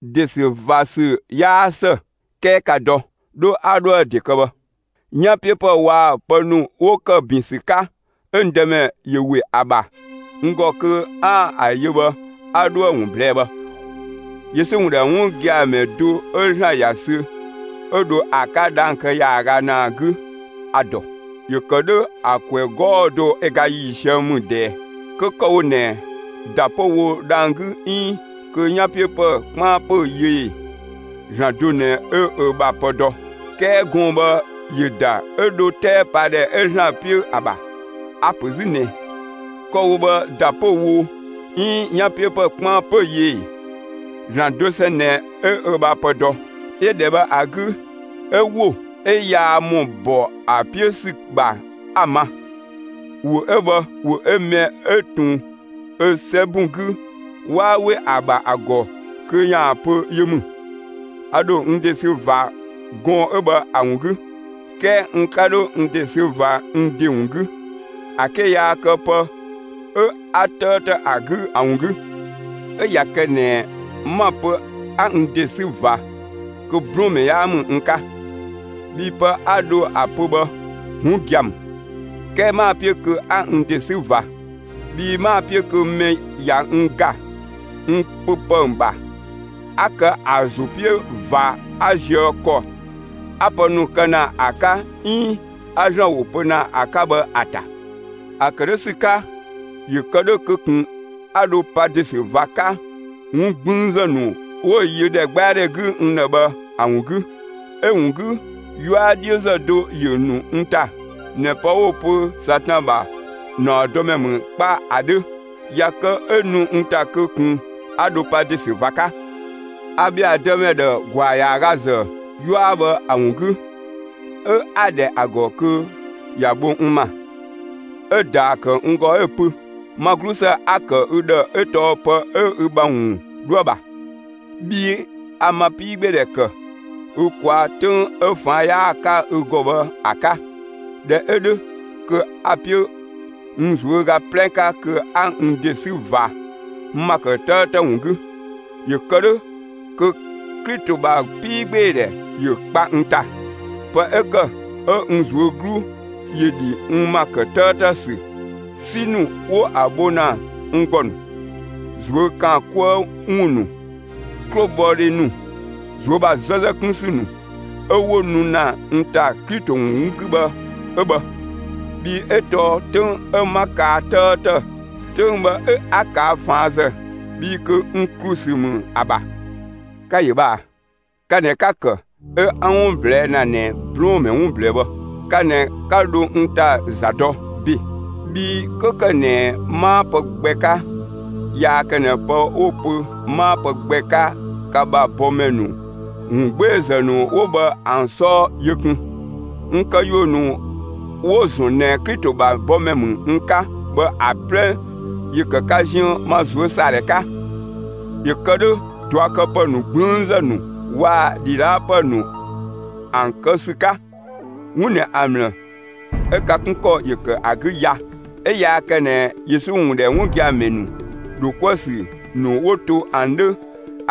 ‑De ‑sü ꞊va ‑sü 'yaa ‑së 'kɛɛ ‑ka dɔ! 'Dho 'a 'dhoë‑ ‑de kë bhë. 'Yanpiöpë waa‑ pë ‑nu 'wo ‑kë ‑bin ‑sü 'ka 'ö Dëmɛ ‑yö ‑we ‑a ‑bha n ‑gɔ kö 'aan‑ ‑an yö bhë a 'dhoë‑ ‑wun ꞊blɛɛ'‑ bhë. Yesu ‑wun ‑dhɛ 'wun gia‑ ‑mɛ do 'ö ‑Zlan ‑ya sü 'ö dho ‑a 'ka dhang‑ kë ‑yaaga ‑naa 'gü, a‑ ‑dɔ. ‑Yö ‑kë 'dhö ‑a ‑kwɛ 'gɔɔ‑ do ö ga ‑yiisië ‑mü ꞊dɛɛ; (kö kë‑ wo ꞊nɛ, ‑da 'pö‑ wo dhang‑ 'gü 'iin kö 'yanpiöpë 'kpaan 'pö‑ yö ee; ‑Zlan do ꞊nɛ 'ö ö ‑bha pë dɔ). 'Kɛɛ gɔɔn‑ bhë ‑yö ‑da 'ö dho 'tɛɛpadhɛ 'ö ‑Zlan 'piö ‑a ‑bha. (A‑ ‑pö 'zü ꞊nɛ, kë‑ wo bhë ‑da 'pö‑ wo, 'iin 'yanpiöpë 'kpaan 'pö‑ yö ee; ‑Zlan dosɛn ꞊nɛ 'ö ö ‑bha pë dɔ.) 'Yö ‑dhɛ bhë ‑a 'gü, 'ö ‑wo 'ö yaa ‑mɔ ‑bɔ ‑a 'piö ‑sü ‑bha 'ö‑ ma. ‑Wo 'ö bhë, ‑wo 'ö mɛ 'ö ꞊tun ö 'sɛbun 'gü, 'waa 'we ‑a ‑bha ‑a ‑gɔ kö ‑ya pö yö ‑mü. A ‑dho n ‑de sü ꞊va gɔɔn‑ 'ö bhë ‑a ‑wun 'gü, 'kɛɛ n 'ka 'dho n ‑de sü ꞊va n ‑de ‑wun 'gü, ‑a 'ke yaa kë pë 'ö 'a 'tëëtë ‑a 'gü ‑a ‑wun 'gü. 'Ö ꞊ya kë ꞊nɛ 'ma‑ pö 'a n ‑de ‑sü ꞊va, kö 'blɔɔnmɛ 'yaa ‑mü n 'ka, bhii pë 'a dho ‑a pö bhë 'wun gia‑ ‑mü. 'Kɛɛ 'maa‑ 'piö kö 'a n ‑de 'sü ꞊va. Bhii 'maa‑ 'piö kö mɛ ꞊ya n ‑ga n pö ‑pë ‑bha, 'a kë ‑a ‑zo 'piö ꞊va 'a zië ‑kɔ 'a‑ pë ‑nu kë ‑na 'ka 'iin 'a ‑Zlan ‑wo pö ‑na ‑a 'ka bhë ‑a ‑ta. ‑A ‑kë 'dhö ‑sü 'ka, ‑yö kë 'dhö kö ꞊kun 'a dho pa ‑de ‑sü ꞊va 'ka 'wun 'gblüünzë ‑nu 'wo‑ yö ‑dhɛgbɛadhɛ 'gü n ‑dhë bhë ‑a ‑wun 'gü. 'Ö‑ ‑wun 'gü, 'yua 'dhiözë do ‑yö nu n ‑ta ꞊nɛ pë 'wo‑ pö Satan ‑bha ‑naɔdɔmɛ ‑mü 'kpa ‑a 'dhö. ꞊Ya kë 'ö nu n ‑ta kö ꞊kun 'a dho pa ‑de ‑sü ꞊va 'ka. A ‑bhɛa Dëmɛ ‑dhë ‑gwaa ‑yaaga ‑zë 'yua bhë ‑a ‑wun 'gü, 'ö 'a‑ ‑dhɛ ‑a ‑gɔ kö ‑ya bho n ‑ma. 'Ö‑ ‑daa ‑kë n ‑gɔ 'ö‑ pö: «Ma 'glusë 'a‑ ‑kë ü ‑dhë 'ö bhë tɔɔ pë 'ö ü ‑bha ‑wun 'dhoë‑ ‑bha. Bhii a ma 'piigbeedhɛ ‑kë ü ꞊kwaa' 'töng 'ö ꞊faan' 'yaa‑ 'ka ü ‑gɔ bhë ‑a 'ka.» ꞊Dhɛ 'ö 'dhö kö a‑ 'piö n ꞊zuöga 'plɛ 'ka kö 'a n ‑de 'sü ꞊va n ‑ma ‑kë 'tëëtë ‑wun 'gü; ‑yö kë 'dhö kö Klito ‑bha 'piigbeedhɛ ‑yö kpa n ‑ta. Pë 'ö ‑kë 'ö n ꞊zuö' 'glu ‑yö ‑dhi n ‑ma ‑kë 'tëëtë ‑sü, 'si ‑nu 'wo‑ bho ‑na n ‑gɔ ‑nu, ꞊zuö' ‑kaan 'kuë‑ ‑wun ‑nu, 'klobhɔdhe ‑nu, ꞊zuö' ‑bha 'zëzëdhe 'kun ‑sü ‑nu 'ö 'wo nu ‑na n ‑ta Klito ‑wun 'gü bhë 'ö bhë; bhii 'ö tɔɔ 'töng 'ö 'ma kaa 'tëëtë, 'töng bhë 'ö 'a ꞊kaa' ꞊faanzë (bhii kö n ‑klu ‑sü ‑mü ‑a ‑bha.) Ka‑ ‑yö bhë ꞊aa. Ka ꞊nɛ 'ka‑ ‑kë 'ö 'a 'wun ꞊blɛɛ' ‑na ꞊nɛ 'blɔɔnmɛ 'wun ꞊blɛɛ bhë. Ka ꞊nɛ 'ka dho n ‑ta za dɔ ‑be. Bhii 'kö ‑kë ꞊nɛ 'maa pë gbɛ 'ka, yaa kë ꞊nɛ pë 'wo‑ pö 'maa pë gbɛ 'ka ka ‑bha bɔmɛ ‑nu ‑wungbeezë ‑nu 'wo bhë ‑an 'sɔɔ yö kun. N këyuö ‑nu 'wo‑ ‑zɔn ꞊nɛ Klito ‑bha bɔmɛ ‑mü n 'ka bhë ‑a 'plɛ ‑yö ‑kë ka ziën ma ꞊zuösaadhɛ 'ka. ‑Yö ‑kë 'dhö ꞊duakëpë ‑nu 'gblüünzë ‑nu waa‑ ‑dhidhaapë ‑nu ‑an kë ‑sü 'ka. 'Wun ꞊nɛ ‑a ‑mlë 'ö ka 'kun ‑kɔ ‑yö ‑kë ‑a 'gü ya, 'ö yaa kë ꞊nɛ Yesu ‑wun ‑dhɛ 'wun gia‑ ‑mɛ ‑nu ‑dho 'kuë‑ ‑sü ‑nu 'wo to ‑an 'dhö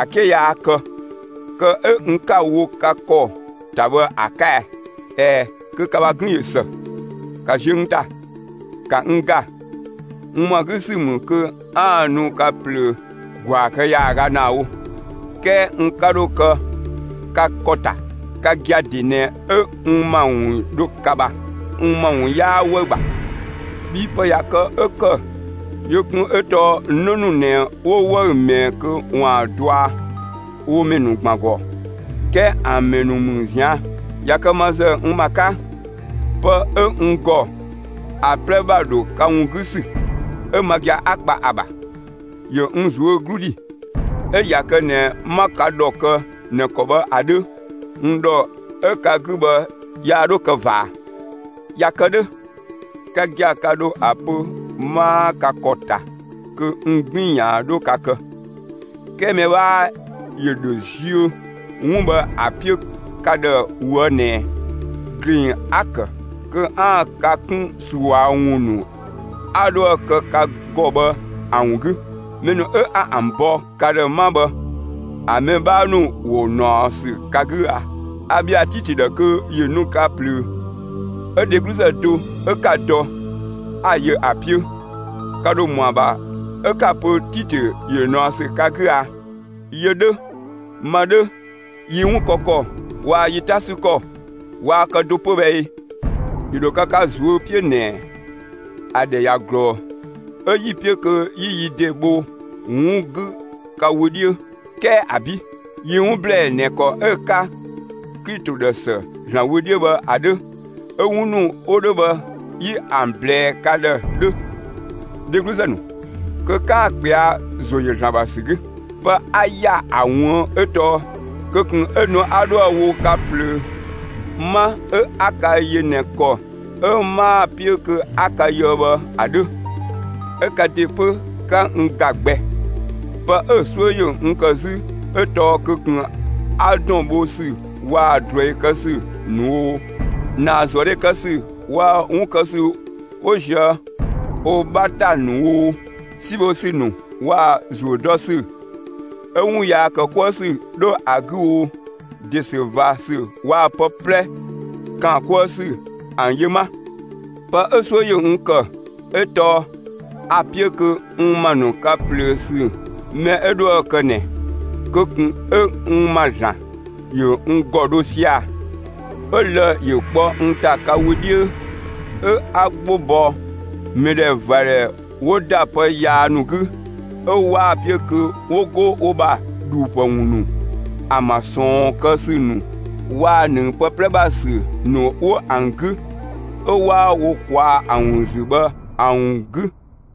‑a 'ke yaa kë, kë 'ö n 'ka‑ wo ka ‑kɔ ‑ta bhë ‑a 'ka ɛɛ? ꞊Ɛɛ, kö ka ‑bha 'gën ꞊yö ‑së; ‑ka ziö n ‑ta! ‑Ka n ‑ga, n ‑mɔa 'gü ‑sü ‑mü kö 'aan‑ nu ka ꞊plöö ‑gwaa kë ‑yaaga ‑naa wo; 'kɛɛ n 'ka 'dho kë ka ‑kɔ ‑ta; ka gia‑ ‑de ꞊nɛ 'ö n ‑ma ‑wun 'dho ka ‑bha; n ‑ma ‑wun 'yaa 'wëü‑ ‑bha. Bhii pë ꞊ya kë 'ö ‑kë yö kun 'ö tɔɔ 'në ‑nu ꞊nɛ 'wo 'wëü‑ ꞊mɛɛ kö ‑waan dɔa wo ‑mɛ ‑nu ‑gban ‑gɔ. 'Kɛɛ ‑an ‑mɛ ‑nu ‑mü ꞊zian'. ꞊Ya kë ma ‑zë n ‑ma 'ka, pë 'ö n ‑gɔ ‑a 'plɛ ‑bha ‑dho ka ‑wun 'gü ‑sü, 'ö ma gia‑ 'a kpa ‑a ‑bha, ‑yö n ꞊zuö' 'glu ‑dhi; 'ö ꞊ya kë ꞊nɛ 'ma ka ‑dhɔ kë ꞊nɛ ‑kɔ bhë ‑a 'dhö, n ‑dhɔ 'ö ka 'gü bhë yaa 'dho kë ꞊va ꞊a? ꞊Ya kë 'dhö, ka gia‑ ka ‑dho ‑a pö 'maa ka ‑kɔ ‑ta kö n 'gbiin‑ ‑yaan 'dho ka kë. 'Kɛɛ mɛ 'bhaa ‑yö ‑dho ziö 'wun bhë ‑a 'piö ka ‑dhë ꞊woë' ꞊nɛ ‑gleng 'a‑ ‑kë kö 'aan‑ ka 'kun ꞊sua ‑wun ‑nu 'a 'dhoë‑ kë ka ‑gɔ bhë ‑a ‑wun 'gü. Mɛ ‑nu 'ö 'a ‑an bɔ ka ‑dhë 'ma bhë, ‑a mɛ 'bhaa ‑nu ‑wo ꞊naɔ ‑sü ka 'gü a? A ‑bhɛa Titö ‑dhë kö ‑yö nu ka ꞊plöö; 'ö dhegluzë do 'ö 'ka‑ dɔ, 'a‑ yö ‑a 'piö. Ka ‑dho ‑mɔa ‑bha 'ö 'ka‑ pö Titö ‑yö ꞊naɔ ‑sü ka 'gü a? Yö 'dhö, ma 'dhö, yi 'wun kë ‑kɔ waa‑ yi 'ta 'sü ‑kɔ waa kë do 'pö bhë ꞊ee? ‑Yö ‑dho kë ka ꞊zuö' 'piö ꞊nɛ, ‑a ‑dhɛ ꞊ya ꞊glɔɔ, 'ö 'yi‑ 'piö kö 'yi yi ‑de bho 'wun 'gü ka wö 'dhiö. 'Kɛɛ ‑abi'! Yi 'wun ‑blɛɛ ꞊nɛ ‑kɔ 'ö‑ 'ka Klito ‑dhë ‑së ‑Zlan wö 'dhiö bhë ‑a 'dhö, 'ö 'wun ‑nu 'wo 'dhö bhë 'yi ‑an ꞊blɛɛ ka ‑dhë 'dhö, dhegluzë ‑nu, kö 'kaan‑ ꞊kpɛa'‑ ‑zo ‑yö ‑Zlan ‑bha ‑sü 'gü. Pë 'a ‑ya ‑a ꞊wuën' 'ö tɔɔ kö ꞊kun 'ö nu 'a 'dhoë‑ wo ka ꞊plöö 'ma 'ö 'a ka yö ꞊nɛ ‑kɔ 'ö 'maa‑ 'piö kö 'a ka yöë bhë ‑a 'dhö, 'ö ka ‑de 'pö 'ka n ‑ga gbɛ. Pë 'ö‑ 'suö ‑yö n ‑kë 'zü 'ö tɔɔ kö ꞊kun 'a ‑dɔn bho ‑sü waa‑ ꞊druɛi kë ‑sü ‑nu oo, ‑naazuëdhe kë ‑sü waa‑ 'wun kë ‑sü 'wo ꞊zië' wo 'bha ‑ta ‑nu oo, 'si bho ‑sü ‑nu waa‑ ‑zuö dɔ ‑sü 'ö 'wun yaa ‑kë 'kuë ‑sü 'dho ‑a 'gü oo, ‑de ‑sü ꞊va ‑sü waa‑ pë 'plɛ ‑kaan 'kuë ‑sü ‑an yö 'ma. Pë 'ö‑ 'suö ‑yö n ‑kë 'ö tɔɔ a‑ 'piö kö n ‑ma ‑nu ka ꞊plöö ‑sü mɛ 'ö 'dhoë‑ kë ꞊nɛ, kö ꞊kun 'ö n ‑ma ‑Zlan ‑yö n ‑gɔ dho sia‑ 'ö lë‑ ‑yö 'kpɔ n ‑ta ka wö 'dhiö, 'ö 'a 'gbo bɔ mɛdhɛvadhɛ 'wo ‑da pë yaa ‑nu 'gü 'ö 'waa‑ 'piö kö 'wo 'go wo ‑bha ‑dhuupë ‑wun ‑nu, ‑an ‑bha ꞊sɔɔn kë ‑sü ‑nu waa‑ ‑nëng pë 'plɛ ‑bha ‑sü ‑nu 'wo ‑an 'gü 'ö 'waa wo ꞊kwaa'‑ ‑an ‑wun ‑zü bhë ‑an ‑wun 'gü.